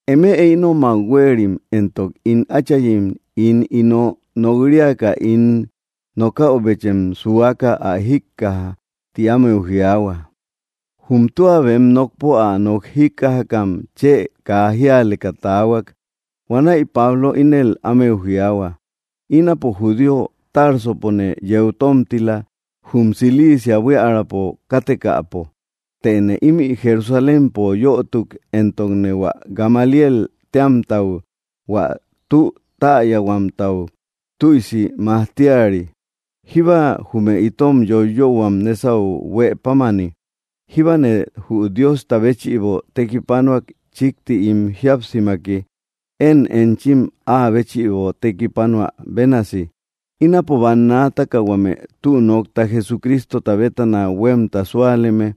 —Eme ínomak huéerim éntok ín áchayim ín ino nok‑riaka ín nokäubechem suaka ä jíkaja —ti ámeu jiaahua. Jum tua bem nokpo ä nok jíkkajakam chë kaa jíaleka taahuak. Huanäi Pablo ínel ámeu jiaahua: —Ínapo judío. Társopone yeu tómtila jum Cilicia buíaräpo kátekäpo, tëne ímï Jerusalémpo yötuk, éntokne hua Gamaliél téamtau, hua tü täyahuäutau, tüisi majtíari, jíba jume itom yóyöhuam nesau huëpámani. Jíbane jü Diosta béchïbo tekipánoak chikti ín jíapsimaki, én enchim áa béchïbo tekipánoä bénasi. Ínapo bannaataka huame tü nokta Jesucrístota bétana huemta súaleme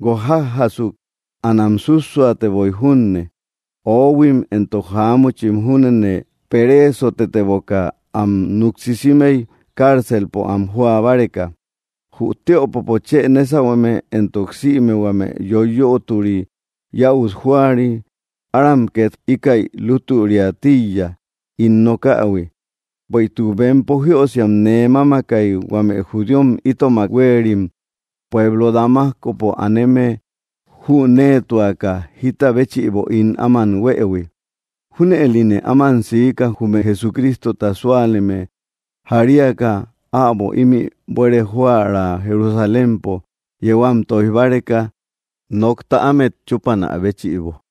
guokjájasuk. Anam sússuateboi junne. Oohuim éntok jaámuchim júnene peréesoteboka am nuksisímei cárcelpo am jóa báreka. Jü tiöpopo chë nésauhueme, éntok sïme huame yoiyötori yäut jóari, áram ket íkäi lútüriä tíiya ín nokähui, bueïtuk bempo jiösiam nee mámakai huame judíom itomak huérim pueblo Damascopo aneme jünéetuaka jita béchïbo ín áman huëhui. Júnëline áman siika jume Jesucrístota súaleme jaríaka äbo ímï buere joära Jerusalémpo yéu am toij báreka, nokta ámet chúpanä béchïbo.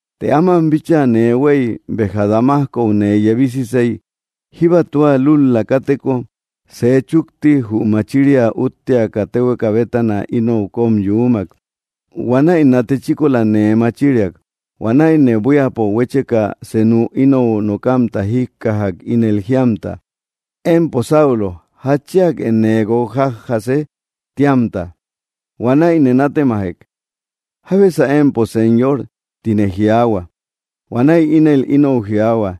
’Të áman bíchaa nee huei, béja Damascou nee yebísisei, jíba tua lul‑la káteko, sej chukti jü machiria útteaka téhueka bétana inou kom yuumak. Huanäi nate chíkola nee machíriak. Huanäine buíapo huécheka senuk inou nokamta jíkkajak ínel jíamta: “Empo Saulo, ¿jatchíake nee guokjájase?”, tíamta. Huanäine nátemajek: “¿Jábesä empo Señor?”, tine jiaahua. Huanäi ínel inou jiaahua: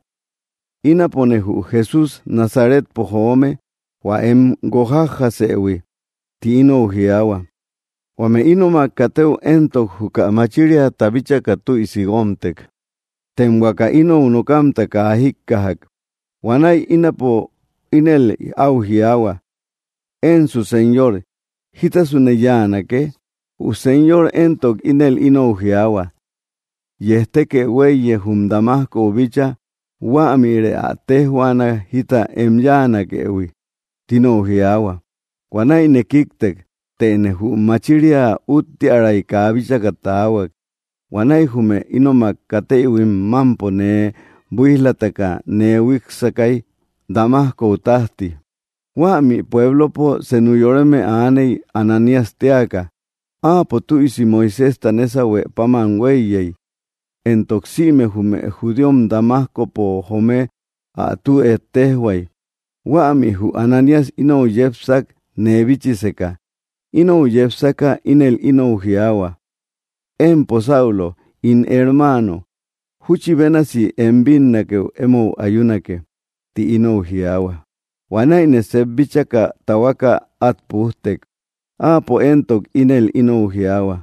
“Ínapone jü Jesús Nazaretpo joome, hua em guokjájasëhui”, tinou jiaahua. Huame ínomak katëu éntok, juka machíriata bíchaka tüisi guómtek, tem huaka inou nokamta kaa jíkkajak. Huanäi ínapo ínel au jiaahua: “Ensu Señor, ¿jítasune yanake?” Jü Señor éntok, ínel inou jiaahua: “Yejtékë huéiye jum Damascou bícha, huämïrë ä téjhuaana jita em yáanakehui”, tinou jiaahua. Huanáine kíktek. Tëne jü machiria úttiäray kaa bíchaka taahuak. Huanäi jume ínomak katéïhuim mampo nee buíj‑lataka nee huíksakai Damascou tajti. ’Huämi puéblopo senu yoreme aaney Ananías téaka. Áapo tüisi Moiséjta nésauhuë páman huéiyey, éntok sïme jume judíom Damascopo joome ä tü éttejhuay. Huämi jü Ananías inou yépsak nee bíchiseka. Inou yepsaka ínel inou jiaahua: “Empo Saulo, ín hermáano, júchi bénasi em bínnakeu emou ayúnake”, tï inou jiáhuak. Huanäine seep bíchaka tahuaka at pújtek. Áapo éntok, ínel inou jiaahua: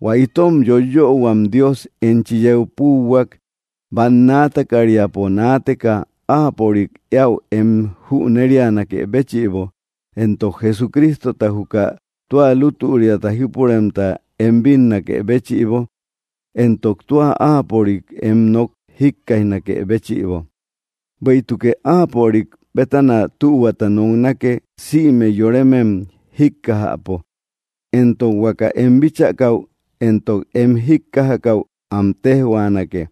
“Huä itom yóiyöhuam Dios enchi yeu púuhuak bannaata kat-riampo naateka áapörik éäu em jünérianakë béchïbo, éntok Jesucrístota, juka tua lútüriata jípuremta, em bínnakë béchïbo éntok tua áapörik em nok jíkkaijnakë béchïbo. Bueïtukë áapörik bétana tühuata noknake sïme yorémem jíkkajäpo, éntok huaka em bíchakäu éntok em jíkkajakäu am téjhuanake.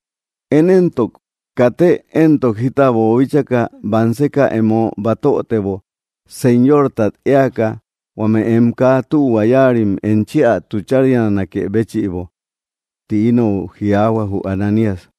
Én éntok, katë éntok jita boobíchaka, banseka emo batötebo Señortat éaka huame em kaa tühua yáarim enchi ä tuchárianakë béchïbo”, tinou jiáhuak jü Ananías.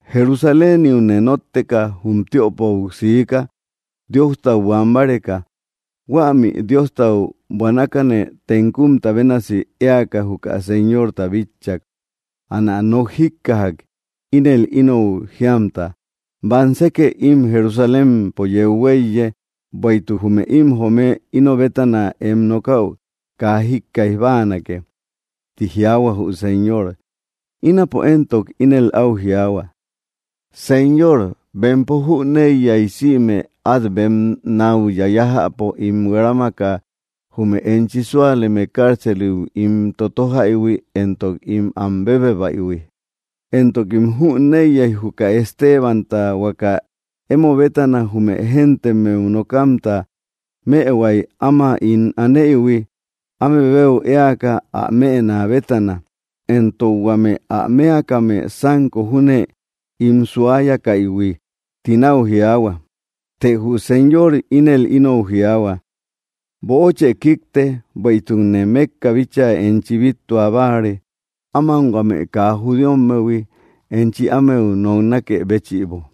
’Jerusaléniune nótteka jum tiöpou siika Diostau buan báreka. Huämi Diostau buanakane tenkumta bénasi éaka juka Señorta bitchak. Anä nok jíkkajak, ínel inou jíamta: “Bamsekë im Jerusalémpo yeu huéiye, bueïtuk jume im joome ino bétana em nokäu kaa jíkkaij báanake”, tï jiaahua jü Señor. Ínapo éntok, ínel au jiaahua: “Señor, bempo jüneiya sïme at bem nau yayajäpo ín huerámaka jume enchi súaleme cárceliu ín totójaïhui, éntok ín am bébebaïhui. Éntokim jüneiya juka Estebanta, huaka emo bétana jume géntemmeu nokamta, mëhuai, áma ín anéïhui áme beu éaka ä mëna bétana, éntok huame ä mëakame sanko júne ín suáyakaïhui”, tinau jiaahua. Të jü Señor ínel inou jiaahua: “Böochë kíkte, bueïtukne mekka bíchaa enchi bíttua báare áman huame kaa judíommehui, enchi ámeu noknákë béchïbo.”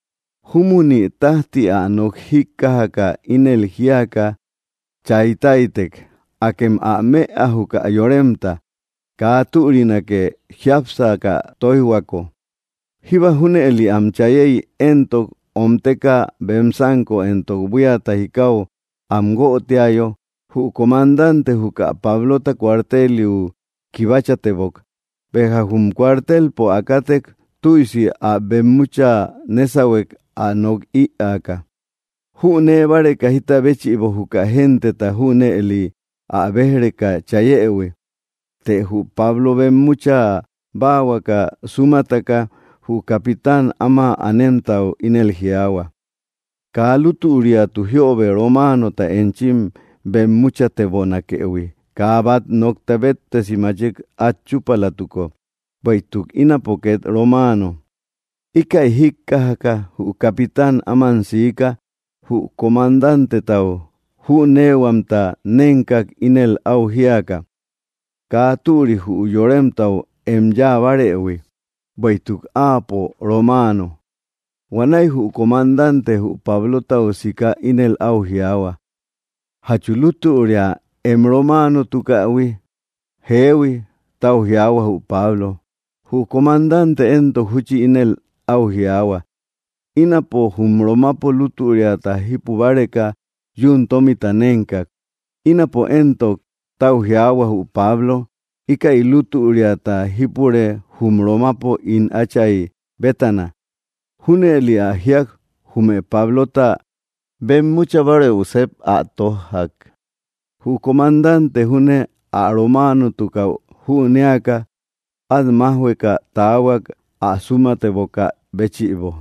Júmunï tájti ä nok jíkkajaka, ínel jíaka cháy táitek: —¡Akem ä mëa júkä yoremta! ¡Kaa türinake jiápsaka tóijhuako! Jíba junëli am chayéi, éntok ómteka bem sanko éntok buíata jikáu am guötiayo, jü comandante juka Pablota cuarteliu kibáchatebok. Béja jum kuartelpo ä kátek, tüisi ä bemmucha nésauhue ä nok ïaaka, jünée báreka jita béchïbo juka genteta junëli ä béj‑reka chayëhui. Të jü Pablo bemmúcha báahuaka súmataka, jü capitán áma anemtau ínel jiaahua: —Kaa lútüriatu jiöbe románota enchim bemmúchatebonakëhui kaa bat nokta béttesi machik at chúpalatuko. Bueïtuk ínapo ket romáano. Íkäi jíkkajaka jü capitán, áman siká jü comandántetau jünéehuamta nénkak ínel au jíaka: —Kaa türi jü yoremtau em yáa bárëhui, bueïtuk áapo romaano. Huanäi jü comandante jü Pablotau siká ínel au jiaahua: —¿Jatchu lútüria em romaanotukähui? —Jéehui —tau jiaahua jü Pablo. Jü comandante éntok, júchi ínel au jiaahua: —Ínapo jum Romapo lútüriata jipu báreka yún tómita nénkak. —Ínapo éntok —tau jiaahua jü Pablo—, íkäi lútüriata jípure jum Romapo ín átchay bétana. Júnëli ä jíak, jume Pablota bemmúchabárëu seep ä tójjak. Jü comandante júne ä romáanotukäu jünéaka, at májhueka taahuak ä sumatébokä béchïbo.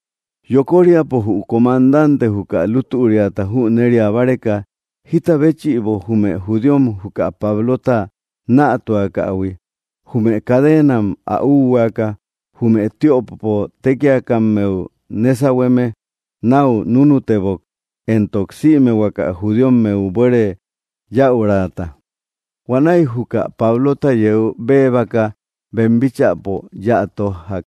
Yokóriapo jü comandante juka lútüriata jünéria báreka, jita béchïbo jume judíom juka Pablota nätuakähui, jume cadenam ä úhuaaka jume tiöpopo tékiakammeu nésauhueme nau núnutebok éntok sïme huaka judíommeu buere yäuraata. Huanäi juka Pablota yeu béebaka bem bíchäpo yéä tójjak.